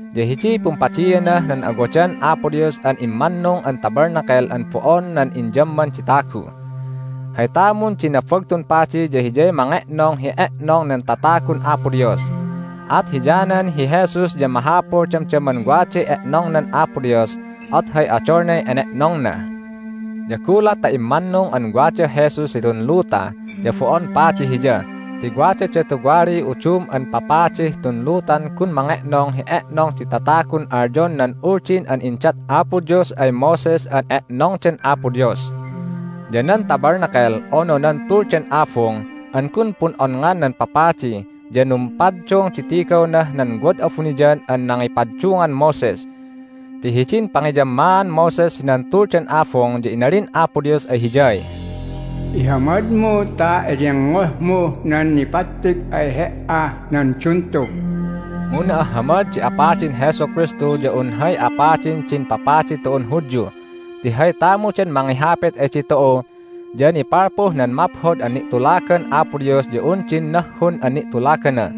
Ya hidiy pumpadianah nan awadan Apo Dios an immannung an Tabernacle an bo'on nan inyamman di tagu. Hay tamun di Nabagtun Padi ya hiyay mange'nong hi e'nong nan tatagun Apo Dios. At hiyanan hi Jesus ya mahapul damdaman waday e'nongnan Apo Dios, at hay odolnay ene'nongna. Ya gulat ta immannung an wadah Jesus hitun luta ya bo'on padi Hiya ti wadada tuwaliy udum an papadih tun lutan gun mange'nong hi e'nong di tatagun alyon nan Uldin an indat Apo Dios ay Moses an e'nongdan Apo Dios. Ya nan Tabernacle (unu nan Tuldan Abung) an gun pun'onngan nan papadi ya numpaddung di tigawnah nan wad abuniyan an nangipaddungan Moses. Ti hidin pangiyammaan Moses hinan Tuldan Abung ya inalin Apo Dios ay hiyay, "Ihamadmu ta eyengngohmuh nan nipattig ay he"ah nan duntug." Mu na'ahhamad di apadin Jesu Kristu ya un hay apadin din papadi tu'un Hudyu ti hay tamudan mangihapit ay ditu'u ya nipalpuh nan maphod an ni'tulagan Apo Dios ya un din nahhun an ni'tulagana,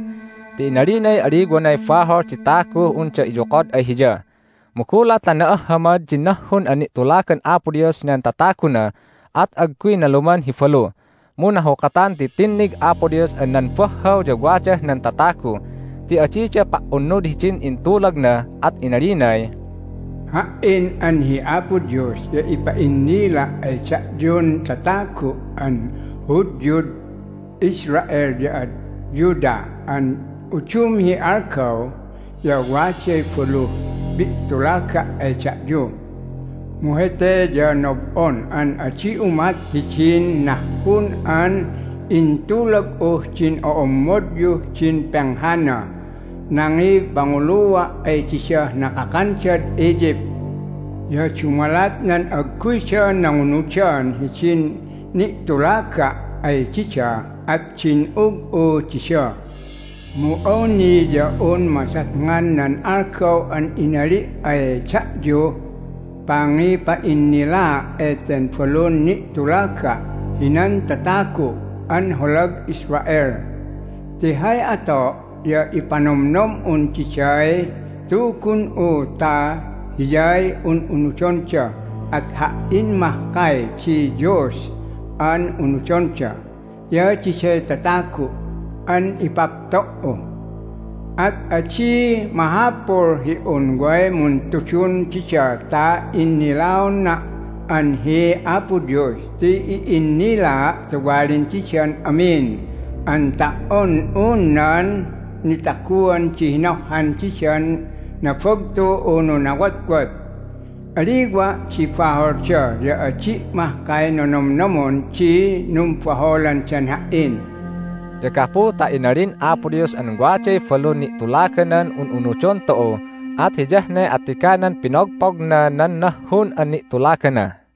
ti inalinay aliwanay bahol di taguh unda iyokod ay Hiya. Mu gulat ta na'ahhamad din nahhun an ni'tulagan Apo Dios hinan tataguna at agguy naluman hi balu. Mu nahukatan ti tinnig Apo Dios an nan bahhaw ya wadah nan tatagu ti adida pa"unud hidin intulagna, at inalinay, "Ha"in an hi Apo Dios ya ipa'innila' ay da'yun tatagu' an Hudyud Israel ya ad Judah an udum hi algaw ya waday baluh pi'tulaga' ay da'yu. Mu hete ya nob'on an adi umat hidin nahhun an intulag'uh din o'ommodyuh din penghanah nangipangulua' ay didah nakakandad Egypt. Ya dumalat nan agguyda nangunudan hidin ni'tulaga' ay dida at din'ug'u dida. Mu awni ya un madatngan nan algaw an inali' ay da'yuh pangipa'innilaa' eten balun ni'tulaga' hinan tatagu' an holag Israel. Ti hay ato' ya ipanomnom'un diday Tugun'u ta hiyay un'unudonda, at Ha"in mahkay di Dios an unudonda, ya diday tatagu' an ipapto"u. At adi mahapul hi un way muntudun dida ta innilaona' an hi Apo Dios ti i'innilaa' tuwalin didan amin an ta"on un nan nitaguan di hinohhan didan nabagtu unu nawotwot. Aliwa' di baholda, ya adi' mahkay nonomnomon di numbaholandan Ha"in." Ya gapu ta inalin Apo Dios an waday balun ni'tulaganan un'unudon tu'u at hiyah ne attiganan pinogpogna nan nahhun an ni'tulagana.